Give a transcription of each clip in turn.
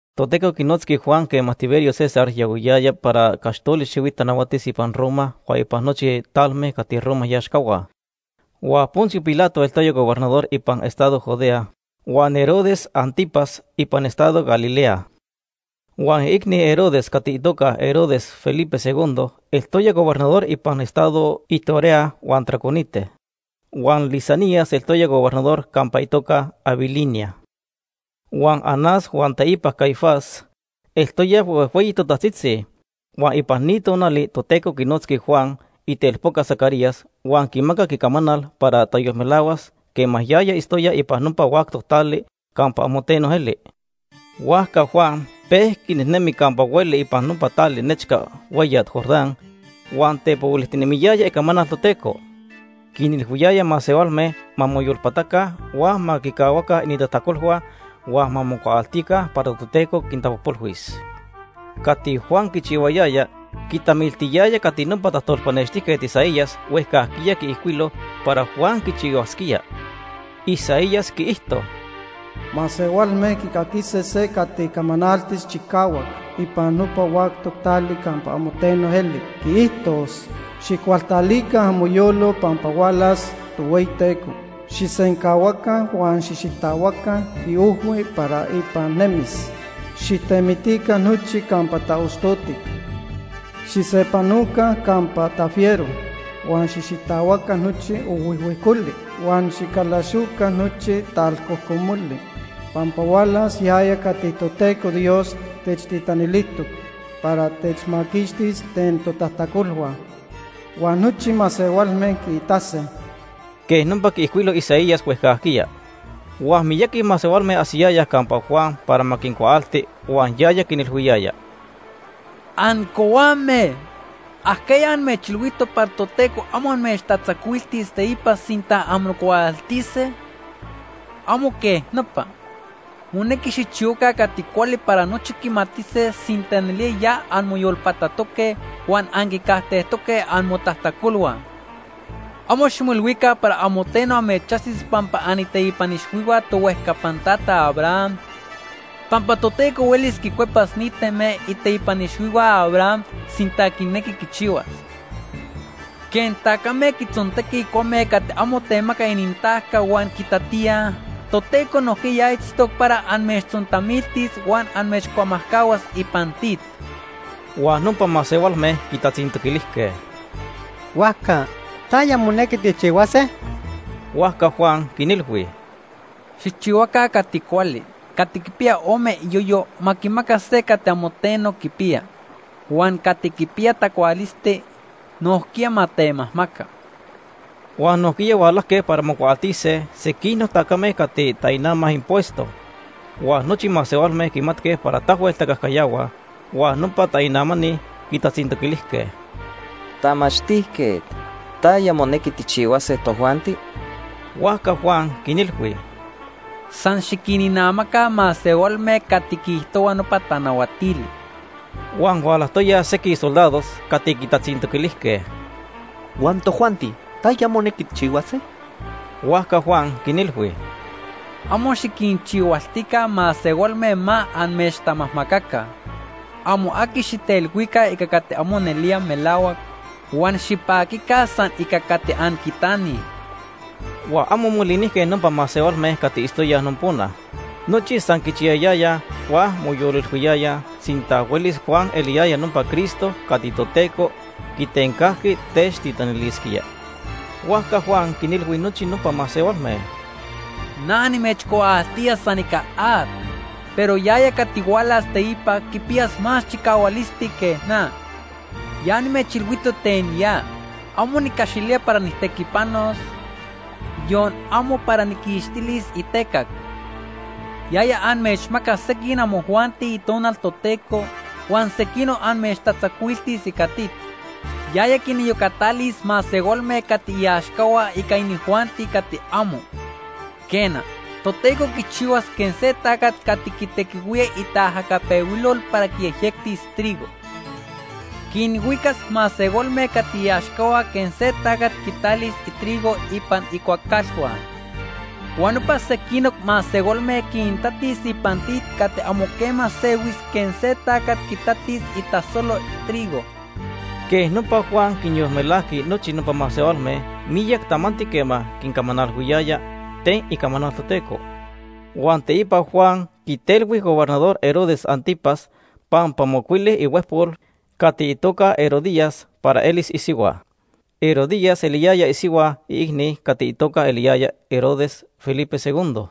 Toteco quinotzqui Juan quema Tiberio César yahuiyaya para caxtoli xihuit tanahuatis ipan Roma huan ipan nochi talme cati Roma iaxcahua. Huan Poncio Pilato eltoya gobernador ipan estado Judea, huan Herodes Ántipas ipan estado Galilea. Huan iicni Herodes cati itoca Herodes Felipe II eltoya gobernador ipan estados Iturea huan Traconite. Huan Lisanias eltoya gobernador campa itoca Abilinia. Huan Anás huan teipa Caifás eltoyaj huejhueyi totajtzitzi. Huan ipan ni tonali Toteco quinotzqui Juan, itelpoca Zacarías, huan quimacac icamanal para tayolmelahuas quema yaya itztoya ipan nopa huactoc tali campa amo teno eli. Huajca Juan pejqui nejnemi campa hueli ipan nopa tali nechca hueyat Jordán, huan tepohuilijtinemiyaya icamanal Toteco. Quinilhuiyaya masehualme ma moyolpataca, huan ma quicahuaca inintajtacolhua huan ma mocuaaltica para Toteco quintapojpolhuis. Cati Juan quichihuayaya quitamiltiyaya cati nopa tajtolpanextijquet Isaías huejcajquiya quiijcuilo para Juan quichihuasquía. Isaías quiijto: “Masehualme quicaquise se cati camanaltis chicahuac ipan nopa huactoc tali campa amo teno eli. Quiijtos: ‘Xijcualtalica amoyolo pampa hualas Tohueyiteco. Xijsencahuaca huan xijxitahuaca iojhui para ipan nemis. Xijtemitica nochi campa taostotic. Xijsepanoca campa tafiero, huan xijxitahuaca nochi ojhuijhuijcoli, huan xicalaxoca nochi talcojcomoli. Pampa hualas yaya cati Toteco Dios techtitanilijtoc para techmaquixtis ten totajtacolhua, huan nochi masehualme quiitase.’” Quej nopa quiijcuilo Isaías huejcajquiya. Huan miyaqui masehualme ajsiyayaj campa Juan para ma quincuaalti, huan yaya quinilhuiyaya: ―Ancohuame. ¿Ajquiya amechilhuijtoc para Toteco amo amechtatzacuiltis teipa sinta anmocuaaltise? Amo quej nopa. Monequi xijchihuaca cati cuali para nochi quimatise sinta nelía ya anmoyolpatatoque huan anquicajtejtoque amotajtacolhua. Amo ximoilhuica para amo teno amechajsis pampa aniteipan ixhuihua tohuejcapan tata Abraham, pampa Toteco hueli quincuepas ni teme iteipan ixhuihua Abraham sinta quinequi quichihuas. Quej tacame quitzontequij cuame cati amo temacaj inintajca huan quitatíaj, Toteco nojquiya ya itztoc para amechtzontamiltis huan amechcuamajcahuas ipan tit. Huan nopa masehualme quitatzintoquilijque: ―Huajca, ¿taya monequi tijchihuase? Huajca Juan quinilhui: ―Xijchihuaca cati cuali. Cati quipiya ome iyoyo ma quimaca se cati amo teno quipiya. Huan cati quipiya tacualisti nojquiya ma temajmaca. Huan nojquiya hualajque para mocuaaltise sequinoc tacame cati tainamaj impuesto, huan nochi masehualme quimatque para tahuel tacajcayahuaj, huan nopa tainamani quitatzintoquilijque: ―Tamachtijquet, ¿taya monequi tijchihuase tojuanti? Huajca Juan quinilhui: ―San xiquininamaca masehualme cati quiijtohua nopa tanahuatili. Huan hualajtoyaj sequij soldados cati quitatzintoquilijque: ―Huan tojuanti, ¿taya monequi tijchihuase? Huajca Juan quinilhui: ―Amo xiquinchihualtica masehualme ma amechtamajmacaca. Amo aqui xijtelhuica ica cati amo nelía melahuac huan xipaquica san ica cati anquitanij. Huan amo molinijque nopa masehualme cati itztoyaj nopona. Nochi san quichiyayayaj huan moyolilhuiyayaj sinta huelis Juan eliyaya nopa Cristo cati Toteco quitencajqui techtitanilisquía. Huajca Juan quinilhui nochi nopa masehualme: ―Na nimechcuaaltía san ica at, pero yaya cati hualas teipa quipiyas más chicahualisti que na. Ya nimechilhuijtoc ten ya. Amo nicaxilía para nijtequipanos, yon amo para nijquixtilis itecac. Yaya amechmacas sequij amojuanti Itonal Toteco huan sequinoc amechtatzacuiltis ica tit. Yaya quiniyocatalis masehualme cati iaxcahua ica inijuanti cati amo. Quena, Toteco quichihuas quej se tacat cati quitequihuía itaajacapehuilol para quiyejyectis trigo. Quinhuicas masehualme cati iaxcahua quej se tacat quitalis itrigo ipan icuacalhua. Huan nopa sequinoc masehualme quintatis ipan tit cati amo quema sehuis quej se tacat quitatis itasolo trigo. Quej nopa, Juan quinyolmelajqui nochi nopa masehualme miyac tamanti quema quincamanalhuiyaya ten icamanal Toteco. Huan teipa Juan quitelhui Gobernador Herodes Ántipas pampa mocuili ihuejpol cati itoca Herodías para elis isihua. Herodías eliyaya isihua iicni cati itoca eliyaya Herodes Felipe II.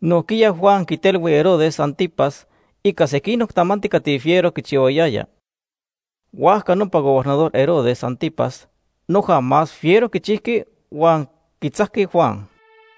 Nojquiya Juan quitelhui Herodes Ántipas ica sequinoc tamanti cati fiero quichihuayaya. Huajca nopa Gobernador Herodes Ántipas noja más fiero quichijqui huan quitzajqui Juan.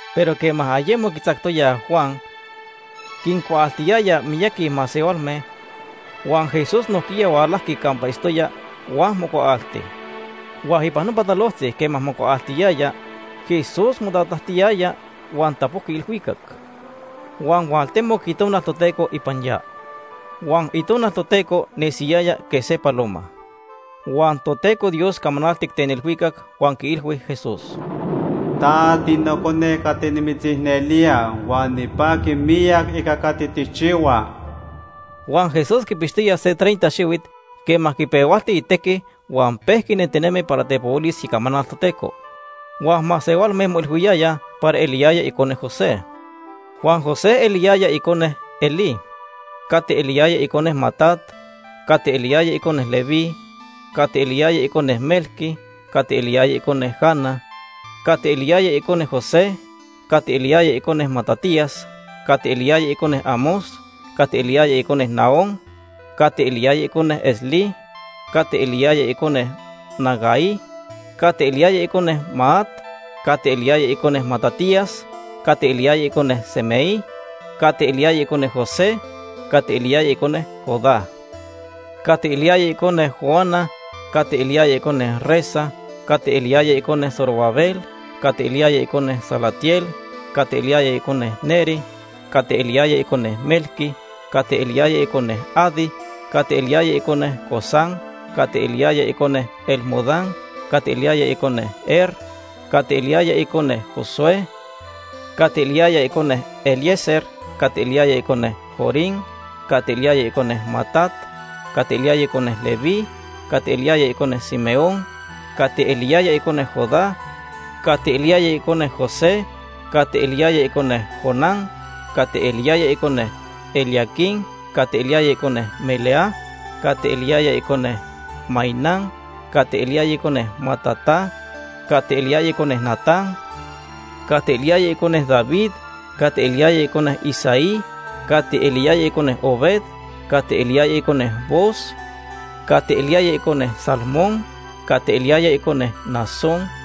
Pero quema ayemo quitzactoyaj Juan, quincuaaltiyaya miyaqui masehualme, huan Jesús nojquiya hualajqui campa itztoya huan mocuaalti. Huan ipan nopa talojtzi quema mocuaaltiyaya, Jesús motatajtiyaya huan tapojqui ilhuicac, huan hualtemoc Itonal Toteco ipan ya. Huan Itonal Toteco nesiyaya quej se paloma. Huan Toteco Dios camanaltic ten ilhuicac huan quiilhui Jesús: ―Ta tiNocone cati nimitzicnelía huan nipaqui miyac ica cati tijchihua. Huan Jesús quipixtoya se treinta xihuit quema quipehualti itequi huan pejqui nentinemi para tepohuilis icamanal Toteco. Huan masehualme moilhuiyayaj para eliyaya icone José. Huan José eliyaya icone Elí, cati eliyaya icone Matat, cati eliyaya icone Leví, cati eliyaya icone Melqui, cati eliyaya icone Jana, cati eliyaya icone José, cati eliyaya icone Matatías, cati eliyaya icone Amós, cati eliyaya icone Nahúm, cati eliyaya icone Esli, cati eliyaya icone Nagai, cati eliyaya icone Maat, cati eliyaya icone Matatías, cati eliyaya icone Semei, cati eliyaya icone José, cati eliyaya icone Judá, cati eliyaya icone Joana, cati eliyaya icone Resa, cati eliyaya icone Zorobabel, cati eliyaya icone Salatiel, cati eliyaya icone Neri, cati eliyaya icone Melqui, cati eliyaya icone Adi, cati eliyaya icone Cosam, cati eliyaya icone Elmodam, cati eliyaya icone Er, cati eliyaya icone Josué, cati eliyaya icone Eliezer, cati eliyaya icone Jorim, cati eliyaya icone Matat, cati eliyaya icone Leví, cati eliyaya icone Simeón, cati eliyaya icone Judá, cati eliyaya icone José, cati eliyaya icone Jonán, cati eliyaya icone Eliaquim, cati eliyaya icone Melea, cati eliyaya icone Mainán, cati eliyaya icone Matata, cati eliyaya icone Natán, cati eliyaya icone David, cati eliyaya icone Isaí, cati eliyaya icone Obed, cati eliyaya icone Booz, cati eliyaya icone Salmón, cati eliyaya icone Naasón,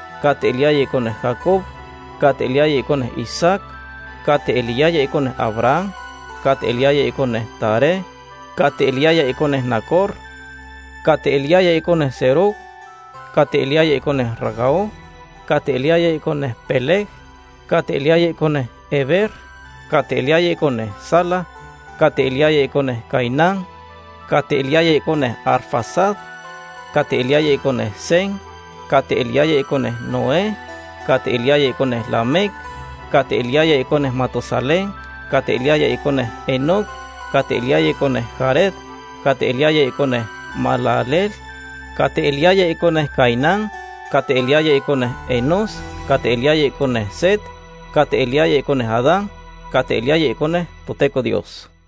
cati eliyaya icone Jacob, cati eliyaya icone Isaac, cati eliyaya icone Abraham, cati eliyaya icone Taré, cati eliyaya icone Nacor, cati eliyaya icone Serug, cati eliyaya icone Ragau, cati eliyaya icone Peleg, cati eliyaya icone Heber, cati eliyaya icone Sala, cati eliyaya icone Cainán, cati eliyaya icone Arfaxad, cati eliyaya icone Sem, cati eliyaya icone Noé, cati eliyaya icone Lamec, cati eliyaya icone Matusalén, cati eliyaya icone Enoc, cati eliyaya icone Jared, cati eliyaya icone Mahalaleel, cati eliyaya icone Cainán, cati eliyaya icone Enós, cati eliyaya icone Set, cati eliyaya icone Adán, cati eliyaya icone Toteco Dios.